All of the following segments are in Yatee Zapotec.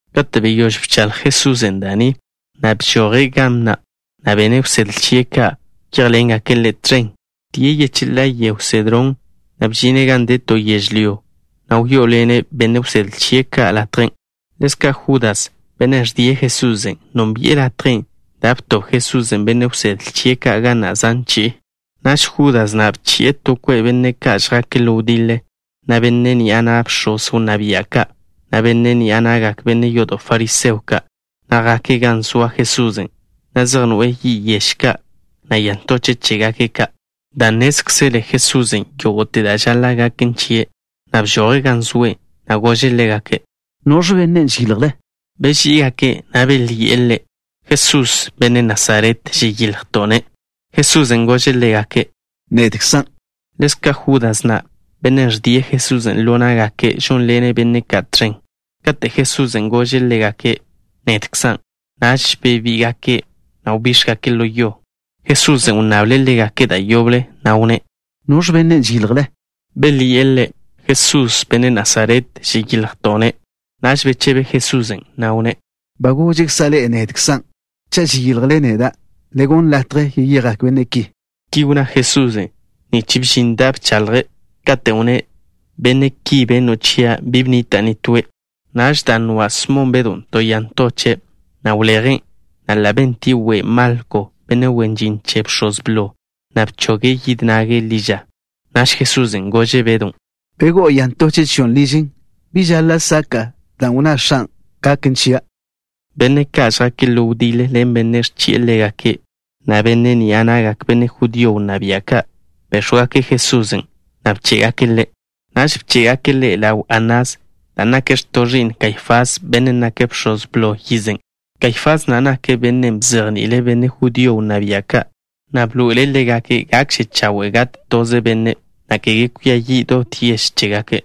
Kate' beyóž bchaḻj Jesusen' da' ni, bžoje' ga na', na' benne' wsedle chie' ka' wyéjḻengake' Ḻe' tẕen. Wdíe' yecheḻá'a yego Sedrón, na' bžine' gan de to yežlyó, na' wyó'oḻene' benne' wsedle chie' ka' latjen'. Ḻezka' Judas, bennen' ẕdie' Jesusen', nónbi'e latjen' dan' btob Jesusen' benne' wsedle chie' ka' ga na' zan chi'i. Naž Judas na' bchi'e to kwe' benne' ka' žjake' ḻo wdiḻe, na' benne' ni'a na'gak bx̱oz wnná bia' ka', na' benne' ni'a na'gak benne' yodo' fariseo ka', na' jake' gan zoa Jesusen', zej noe'e yi' yež ka', na' ya ntoche' chégake' ka'. Dan' nnézkzele Jesusen' yógo'te da' žaḻa' gaken chie', bžoje' gan zoe', na' gože' ḻégake': —¿Noẕ benne' žeyiljle? Beží'igake', na' belyi'e Ḻe': —Jesús, benne' Nasaret, žeyiljto'-ne'. Jesusen' gože' ḻégake': —Nedkzan'. (Ḻezka' Judas na', bennen' ẕdie' Jesusen' ḻo ná'gake', žónḻene' benne' ka' tẕen.) Kate' Jesusen' gože' ḻégake': “Nedkzan'” naž bebíga'gake', na' wbíx̱gake' ḻo yo. Jesusen' wnnable' ḻégake' da' yoble, na' wnné': —¿Noẕ benne' žeyiljle? Belyi'e Ḻe': —Jesús, benne' Nazaret, žeyiljto'-ne'. Naž bechebe Jesusen', na' wnné': —Ba goža' ḻe'e, nedkzan'. Cha' žeyiljle neda', le gonn latje yeyejgak benne' ki. Ki wnná Jesusen' nich bžin da' bchaḻje', katen' wnné': “Benne' ki benno' chia', bi bnita' nitóe'.” Naž, dan' nwa' Smon Bedw to ya ntoche', wlejen', na' ḻa' bentie' we' Malko, benne' wen žin che bx̱oz blo, na' bchoge' yid nage' ḻi ža. Naž Jesusen' gože' Bedon': —Begó'o ya ntoche' chio' ližen. ¿Bi žaḻa' saka'a dan' wnná X̱an' gaken chia'? Benne' ka' žjake' ḻo wdiḻe ḻen bennen' ẕchi'e ḻégake', na' benne' ni'a na'gak benne' judío wnná bia' ka', béx̱wgake' Jesusen', na' bchéjgake' Ḻe'. Naž bché'gake' Ḻe' ḻaw Anás, dan' nake' x̱to' ẕi'n Kaifás, bennen' nake' bx̱oz blo yizen'. Kaifás na' nake' bennen' bzejni'ile' benne' judío wnná bia' ka', na' bḻoe'ele' ḻégake' gakže chawe' gat toze benne', na' kege kwia yi' dot yež chégake'.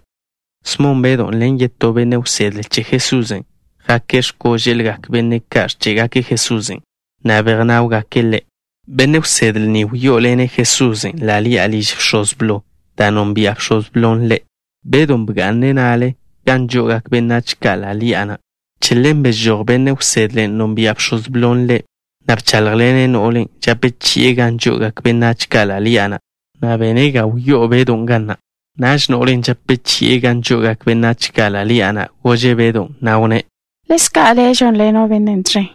Smon Bedw ḻen yetó benne' wsedle che Jesusen', jake' x̱kóže'lgak benne' ka' ẕché'gake' Jesusen', na' bejnáwgake' Ḻe'. Benne' wsedle ni wyó'oḻene' Jesusen' ḻa' ḻi'a liž bx̱oz blo, dan' nonbia' bx̱oz blon' ḻe'. Bedon' bga'ne' na'le gan žo'ogak benách ka' ḻa' ḻi'a na'. Che ḻen bežój benne' wsedlen' nonbia' bx̱oz blon' ḻe', na' bcháḻjḻene' no'len' žape chi'e gan žo'ogak benách ka' ḻa' ḻi'a na', na' bene' ga wyó'o Bedon' ga na'. Naž no'len' žape chi'e gan žo'ogak benách ka' ḻa' ḻi'a na' gože' Bedon', na' wnné': —¿Ḻezka' le' žónḻeno' Bennen' tẕen?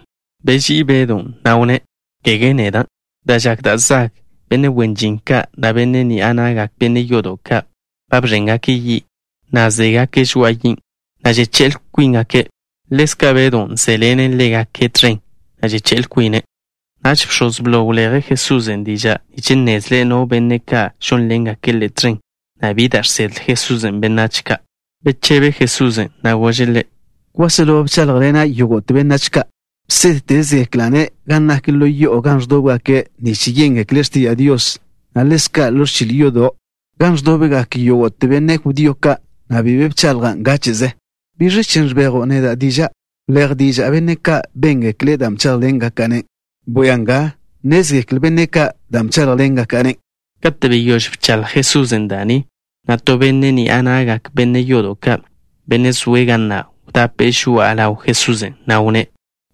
Beží'i Bedon', na' wnné': —Kege neda'. Dan' žak da' zag, benne' wen žin ka', na' benne' ni'a na'gak benne' yodo' ka', ba bẕéngake' yi', na' zégake' žoa'a yin', na' žeché'l kwíngake'. Ḻezka' Bedon' zéḻene' ḻégake' tẕen, na' žeché'l kwine'. Naž bx̱oz blo wleje' Jesusen' diža' nich nnezle' no benne' ka' žónḻengake' Ḻe' tẕen, na' bi da' žsedle Jesusen' benách ka'. Bechebe Jesusen', na' gože' ḻe': —Kwáselo bcháḻjḻena' yógo'te benách ka'. Bsédtezegekla'-ne' gan nak ḻo yo'o gan ẕdóbgake' nich yéngekle' x̱tiža' Dios, na' ḻezka' ḻo ẕchil yodo', gan ẕdobgak yógo'te benne' judío ka', na' bi be bchaḻja' ngáche'ze. ¿Biẕ chen' ẕbejo' neda' diža'? Wléj diža' benne' ka' béngekle' da' bcháḻjḻengaka'-ne'. Bwia nga, nnézgekle benne' ka' dan' bcháḻjḻengaka'-ne'. Kate' beyóž bchaḻj Jesusen' da' ni, na' to benne' ni'a na'gak benne' yodo' ka', benne' zoe' ga na', wdape'e žoa'a ḻaw Jesusen', na' wnné':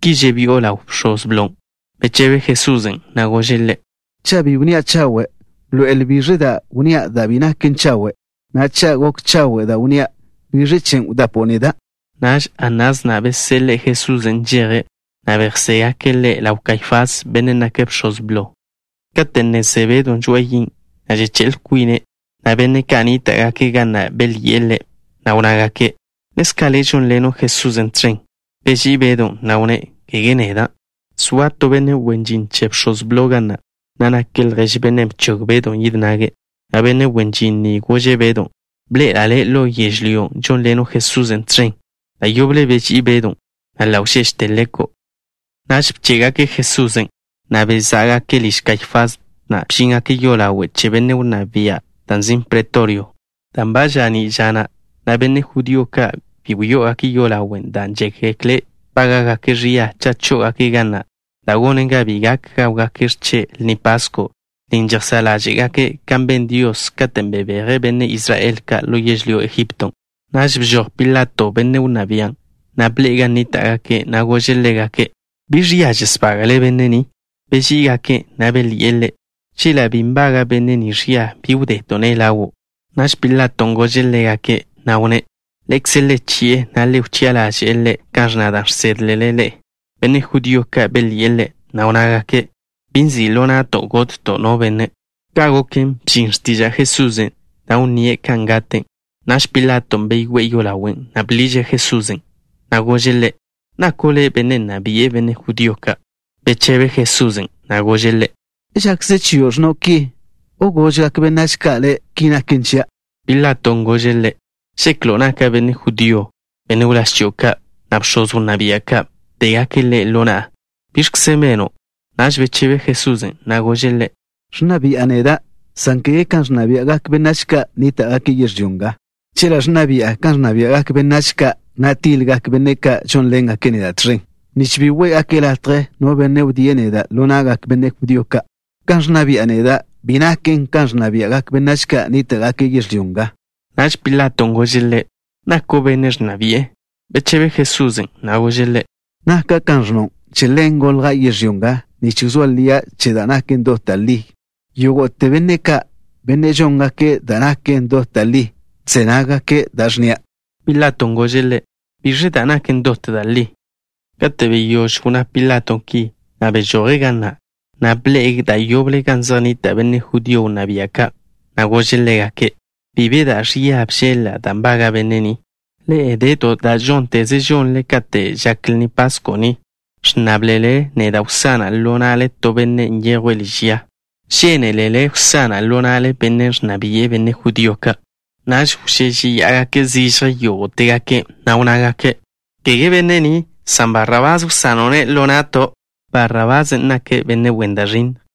—¿Ki žebi'o ḻaw bx̱oz blon'? Bechebe Jesusen', na' gože' ḻe': —Cha' bi wnnía' chawe', bḻoe'el biẕ da' wnnía' da' bi naken chawe', na' cha' gok chawe' da' wnnía', ¿biẕ chen' wdapo'o neda'? Naž Anás na' beseḻe'e Jesusen' nžeje', na' bejzégake' Ḻe' ḻaw Kaifás, bennen' nake' bx̱oz blo. Kate' ne ze Bedw žoa'a yi', žeché'l kwine', benne' ka' nníta'gake' ga na' belyi'e ḻe', na' wnnágake': —¿Ḻezka' le' žónḻeno' Jesusen' tẕen? Beží'i Bedon', na' wnné': —Kege neda'. Zoa to benne' wen žin che bx̱oz blo ga na', na' nake' ljež bennen' bchog Bedon' yid nage', na' benne' wen žin ni gože' Bedon': —Bḻe'ela' le' ḻo yežlyón', žónḻeno' Jesusen' tẕen. Da' yoble beží'i Bedon', na' ḻa' wžéžete leko'. Naž bché'gake' Jesusen', na' bezá'gake' liž Kaifás, na' bžíngake' yolawe' che benne' wnná bia', dan' nzin' Pretorio. Dan' ba ža'ní' ža na', na' benne' judío ka' bi wyó'ogake' yolawen' dan' žékgekle' bága'gake' ẕia cha' chó'ogake' ga na', da' gonen ga bi gak gáwgake' x̱che' Lni Pasko', lnin' žejsá' ḻáže'gake' kan ben Dios, katen' bebeje' benne' Israel ka' ḻo yežlyó Egipto. Naž bžoj Pilato, benne' wnná bian', na' bḻe'e gan nníta'gake', na' gože' ḻégake': —¿Biẕ ẕia žesbága'le benne' ni? Beží'igake', na' belyi'e ḻe': —Chela' bi nbaga' benne' ni ẕia, bi wdeto'-ne' ḻawo'. Naž Pilaton' gože' ḻégake', na' wnné': —Ḻe'ekze le chi'e, na' le wchi'a ḻaže'e Ḻe' kan ẕnna da' žsédlele ḻe'e. Benne' judío ka' belyi'e ḻe', na' wnnágake': —Bi nzi' ḻo na'to' gotto' no benne'. Ka' goken, bžin x̱tiža' Jesusen', da' wnníe' kan gate'. Naž Pilaton' beyoé'e yolawen', na' bḻiže' Jesusen', na' gože' Ḻe': —¿Nako' le' benne' nna bi'e benne' judío ka'? Bechebe Jesusen', na' gože' ḻe': —¿Žakze chio' ẕnno' ki, o gožgak benách ka' le' ki naken chia'? Pilaton' gože' Ḻe': —¿Žeklo' naka' benne' judío? Benne' wláž chio' ka', na' bx̱oz wnná bia' ka', bdégake' Le' ḻo na'a. ¿Biẕkze beno'? Naž bechebe Jesusen', na' gože' ḻe': —Ẕnna bi'a neda', san kege kan ẕnna bia'gak benách ka' nníta'gake' yežlyó nga. Chela' ẕnna bi'a kan ẕnna bia'gak benách ka', na' tiḻgak benne' ka' žónḻengake' neda' tẕen, nich bi wé'gake' latje no benne' wdíe' neda' ḻo na'gak benne' judío ka'. Kan ẕnna bi'a neda' bi naken kan ẕnna bia'gak benách ka' nníta'gake' yežlyó nga. Naž Pilaton' gože' Ḻe': —¿Nako' benne' ẕnna bi'e? Bechebe Jesusen', na' gože' ḻe': —Naka' kan ẕnno'. Che ḻen golja' yežlyó nga, nich wzóa lia' che da' naken dot da' li. Yógo'te benne' ka', benne' žóngake' da' naken dot da' li, ẕze nággake' da' ẕnnia'. Pilaton' gože' Ḻe': —¿Biẕen' da' naken dot da' li? Kate' beyóž wnná Pilato ki, bežoje' ga na', na' bḻe'e da' yoble gan zej nnita' benne' judío wnná bia' ka', na' gože' ḻégake': —Bi be da' ẕia bžeḻ-la' da' nbaga' benne' ni. Ḻe'e de to da' žónteze žonle kate' žak Lni Pasko' ni, ẕnnáblele neda' wsana' ḻo na'le to benne' nyejwe' liž ya. ¿Žénelele wsana' ḻo na'le benne' ẕnna bi'e benne' judío ka'? Naž wžéžeya'agake' zižje yógo'tegake', na' wnnágake': —Kege benne' ni, san Barrabás wsano'-ne' ḻo na'to'. Barrabásen' nake' benne' wen da' ẕinnj.